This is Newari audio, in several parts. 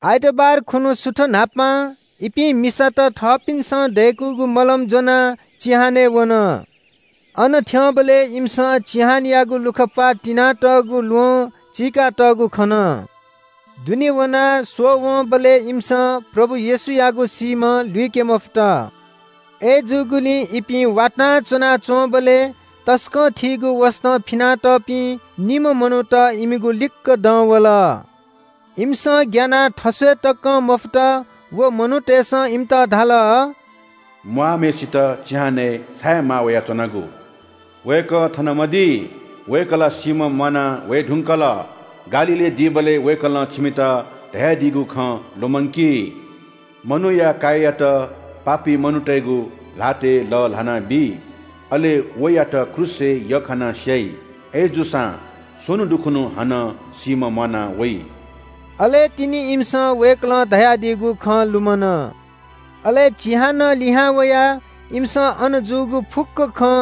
आइतबार खुन्‍हु सुथ न्‍हापां इपिं मिसात थःपिन्‍सं दय्‌कूगु मलम ज्‍वनाः चिहानय् वन। अन थ्‍यंबलय् इमिसं चिहानयागु लुखा प्‍वाः तिनातःगु ल्‍वहं चीकातःगु खन। दुने वनाः स्‍वःवंबलय् इमिसं प्रभु येशूयागु सीम्‍ह लुइके मफुत। अय्‌जूगुलिं इपिं वातां च्‍वनाच्‍वंबलय् तसकं थीगु वसतं फिनातःपिं निम्‍ह मनूत इमिगु लिक्‍क दं वल। इमिसं ग्‍यानाः थस्‍वये तकं मफुत। व मनूतय्‌सं इमित धाल – “म्‍वाःम्‍हय्‌सित चिहानय् छाय् माः वयाच्‍वनागु? वय्‌कः थन मदी। वय्‌कः ला सीम्‍हं म्‍वाना वये धुंकल। गालीलय् दीबलय् वय्‌कलं छिमित धयादीगु खँ लुमंकी – मनूया काय्‌यात पापी मनूतय्‌गु ल्‍हातय् लःल्‍हानाबी, अले वयात क्रूसय् यख्‍खानाः स्‍याइ, अय्‌जूसां स्‍वन्‍हु दुखुन्‍हु हानं सीम्‍हं म्‍वाना वइ।” अले तिनि इमिसं वय्‌कलं धयादीगु खँ लुमन। अले चिहानं लिहां वयाः इमिसं अन जूगु फुक्‍क खँ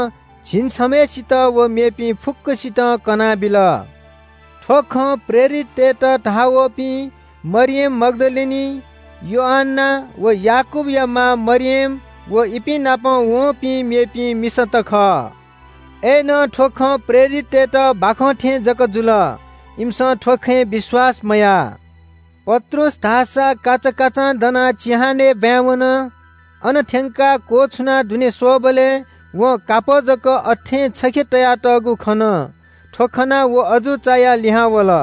झिंछम्‍हय्‌सित व मेपिं फुक्‍कसितं कनाबिल। थ्‍व खँ प्रेरिततय्‌त धाः वःपिं मरियम मग्‍दलिनी, योअन्‍ना व याकूबया मां मरियम व इपिं नाप वंपिं मेपिं मिसात खः। अय्‌नं थ्‍व खँ प्रेरिततय्‌त बाखं थें जक जुल, इमिसं थ्‍व खँय् विश्‍वास मयाः। पत्रुस धाःसा काचाकाचां दनाः चिहानय् ब्‍वाँय् वन। अन थ्‍यंकाः क्‍वछुनाः दुने स्‍वःबलय् वं कापः जक अथें छखे तयातःगु खन। थ्‍व खनाः व अजू चायाः लिहां वल।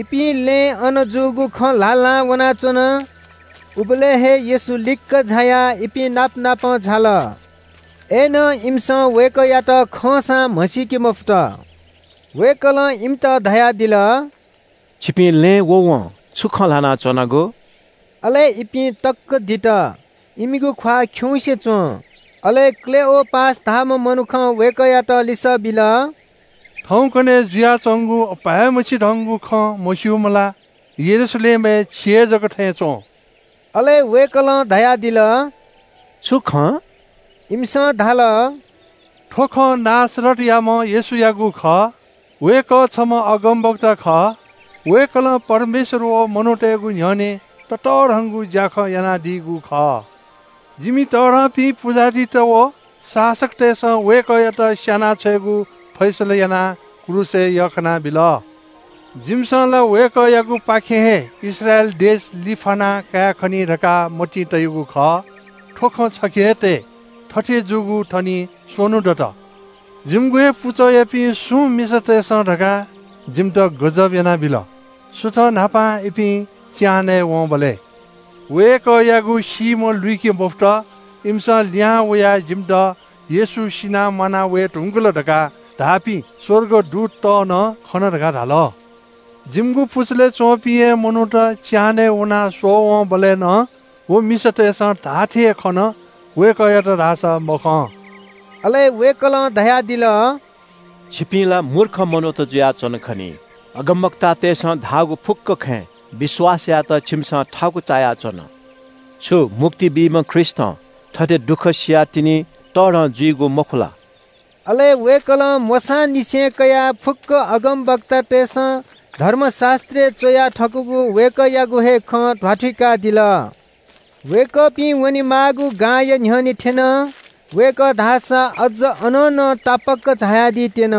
इपिं लँय् अन जूगु खँ ल्‍हाल्‍हां वनाच्‍वन। उबलय् हे येशू लिक्‍क झायाः इपिं नाप नाप झाल। अय्‌नं इमिसं वय्‌कःयात खंसां म्‍हसीके मफुत। वय्‌कलं इमित धयादिल – “छिपिं लँय् व वं छु खँ ल्‍हाना च्‍वनागु?” अले इपिं तक्‍क दित। इमिगु ख्‍वाः खिउँसे च्‍वं। अले क्‍लेओपास धाःम्‍ह मनुखं वय्‌कःयात लिसः बिल – “थौंकन्‍हय् जुयाच्‍वंगु अपाय्‌मछि धंगु खँ मस्‍यूम्‍ह ला यरूशलेमय् छि हे जक थें च्‍वं?” अले वय्‌कलं धयादिल – “छु खँ?” इमिसं धाल – “थ्‍व खँ नासरतयाम्‍ह येशूयागु खः। वय्‌कः छम्‍ह अगमवक्ता खः। वय्‌कलं परमेश्‍वर व मनूतय्‌गु न्‍ह्यःने ततःधंगु ज्‍याखँ यानादीगु खः। जिमि तःधंपिं पुजाहारीत व शासकतय्‌सं वय्‌कःयात स्‍याना छ्वयेगु फैसला यानाः क्रूसय् यख्‍खानाबिल। जिमिसं ला वय्‌कःयागुपाखें हे इस्राएल देश लिफ्‍याना कायेखनी धकाः मतिइ तयागु खः। थ्‍व खँ छखे हे तये। थथे जूगु थनिं स्‍वन्‍हु दत। “जिमिगु हे पुचःयापिं सुं मिसातय्‌सं धकाः जिमित गजब यानाबिल। सुथ न्‍हापां इपिं चिहानय् वंबलय् वय्‌कःयागु सीम्‍ह लुइके मफुत। इमिसं लिहां वयाः जिमित ‘येशू सिनाः म्‍वाना वये धुंकल’ धकाः धाःपिं स्‍वर्गदूतत नं खना धकाः धाल। जिमिगु पुचलय् च्‍वंपिं हे मनूत चिहानय् वनाः स्‍वःवंबलय् नं व मिसातय्‌सं धाःथें हे खन, वय्‌कःयात धाःसा मखं।” अले वय्‌कलं धयादिल – “छिपिं ला मूर्ख मनूत जुयाच्‍वन खनी। अगमवक्तातय्‌सं धाःगु फुक्‍क खँय् विश्‍वास यायेत छिमिसं थाकु चायाच्‍वन। छु मुक्ति बीम्‍ह ख्रीष्‍टं थथे दुःख सियाः तिनि तःधं जुइगु मखु ला?” अले वय्‌कलं मोशांनिसें कयाः फुक्‍क अगमवक्तातय्‌सं धर्मशास्‍त्रय् च्‍वया थकूगु वय्‌कःयागु हे खँ ध्‍वाथुइकादिल। वय्‌कःपिं वनेमाःगु गांया न्‍ह्यःने थ्‍यन। वय्‌कः धाःसा अझ अनं नं तापाक झायादी त्‍यन।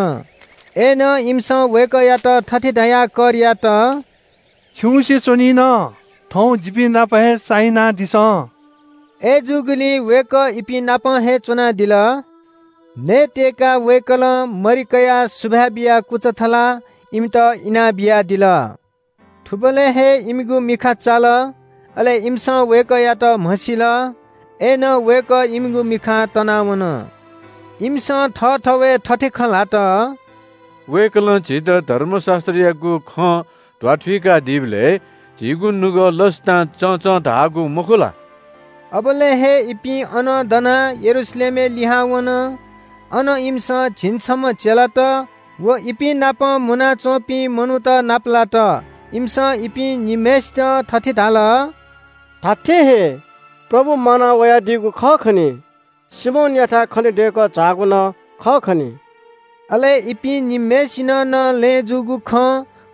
अय्‌नं इमिसं वय्‌कःयात थथे धयाः कर यात – “खिउँसे च्‍वनीन, थौं जिपिं नाप हे चाहिनादिसँ।” अय्‌जूगुलिं वय्‌कः इपिं नाप हे च्‍वनादिल। नयेत्‍यय्‌काः वय्‌कलं मरि कयाः सुभाय् बियाः कुचा थलाः इमित इनाबियादिल। थुबलय् हे इमिगु मिखा चाल, अले इमिसं वय्‌कःयात म्‍हसिल। अय्‌नं वय्‌कः इमिगु मिखां तनावन। इमिसं थःथवय् थथे खँ ल्‍हात – “वय्‌कलं झीत धर्मशास्‍त्रयागु खँ ध्‍वाथुइकादीबलय् झीगु नुगः लसतां चंचं धाःगु मखु ला?” अबलय् हे इपिं अनं दनाः यरूशलेमय् लिहां वन। अन इमिसं झिंछम्‍ह चेलात व इपिं नाप मुनाच्‍वंपिं मनूत नापलात। इमिसं इपिं निम्‍हय्‌सित थथे धाल – “धात्‍थें हे, प्रभु म्‍वाना वयादीगु खः खनी। सिमोनयाथाय् खनेदय्‌कः झाःगु नं खः खनी।” अले इपिं निम्‍हय्‌सिनं नं लँय् जूगु खँ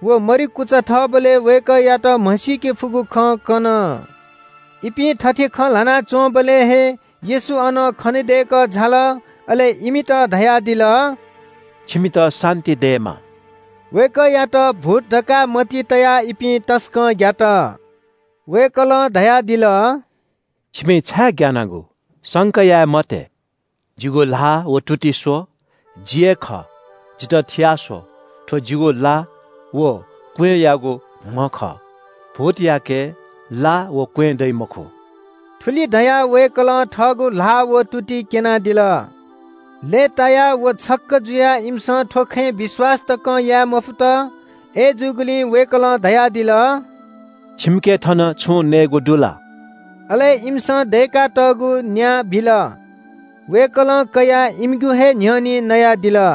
व मरि कुचा थःबलय् वय्‌कःयात म्‍हसीके फुगु खँ कन। इपिं थथे खँ ल्‍हाना च्‍वंबलय् हे येशू अन खनेदय्‌कः झाल। अले इमित धयादिल – “छिमित शान्‍ति दयेमा।” वय्‌कःयात भूत धकाः मतिइ तयाः इपिं तसकं ग्‍यात। वय्‌कलं धयादिल – “छिपिं छाय् ग्‍यानागु? संका याये मते। जिगु ल्‍हाः व तुति स्‍व, जि हे खः, जितः थिया स्‍व, थ्‍व जिगु ला व क्‍वँय्‌यागु म्‍ह खः। भूतयाके ला व क्‍वँय् दइ मखु।” थुलि धयाः वय्‌कलं थःगु ल्‍हाः व तुति क्‍यनादिल। लय्‌तायाः व छक्‍क जुयाः इमिसं थ्‍व खँय् विश्‍वास तकं याये मफुत। अय्‌जूगुलिं वय्‌कलं धयादिल – “छिमिके थन छुं नयेगु दु ला?” अले इमिसं दय्‌कातःगु न्‍या बिल। वय्‌कलं कयाः इमिगु हे न्‍ह्यःने नयादिल।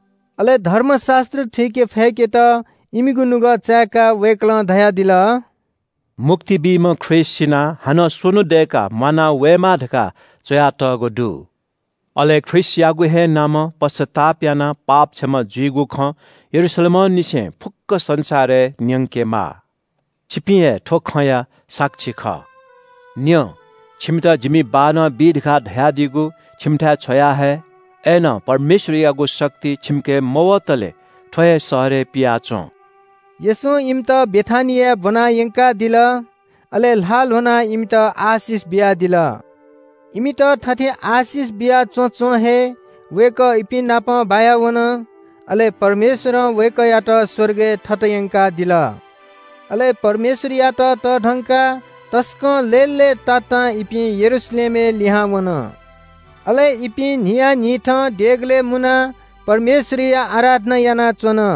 अले धर्मशास्‍त्र थुइके फय्‌केत इमिगु नुगः चाय्‌काः वय्‌कलं धयादिल – “मुक्ति बीम्‍ह ख्रीष्‍ट सिनाः हानं स्‍वन्‍हु दय्‌काः म्‍वाना वयेमाः धकाः च्‍वयातःगु दु। अले ख्रीष्‍टयागु हे नामं पश्‍चाताप यानाः पाप क्षमा जुइगु खँ यरूशलेमंनिसें फुक्‍क संसारय् न्‍यंकेमाः। छिपिं हे थ्‍व खँया साक्षी खः। “न्‍यँ, छिमित जिमि बाःनं बी धकाः धयादीगु छिमिथाय् छ्वयाहये। अय्‌नं परमेश्‍वरयागु शक्ति छिमिके मवतले थ्‍व हे शहरय् पियाच्‍वँ।” येशूं इमित बेथानियाय् ब्‍वना यंकादिल। अले ल्‍हाः ल्‍ह्वनाः इमित आशिष बियादिल। इमित थथे आशिष बिया च्‍वँच्‍वं हे वय्‌कः इपिं नाप बायावन, अले परमेश्‍वरं वय्‌कःयात स्‍वर्गय् थत यंकादिल। अले परमेश्‍वरयात तःधंकाः तसकं लय्‌लय्‌तातां इपिं यरूशलेमय् लिहां वन। अले इपिं न्‍हियान्‍हिथं देगलय् मुनाः परमेश्‍वरया आराधना यानाच्‍वन।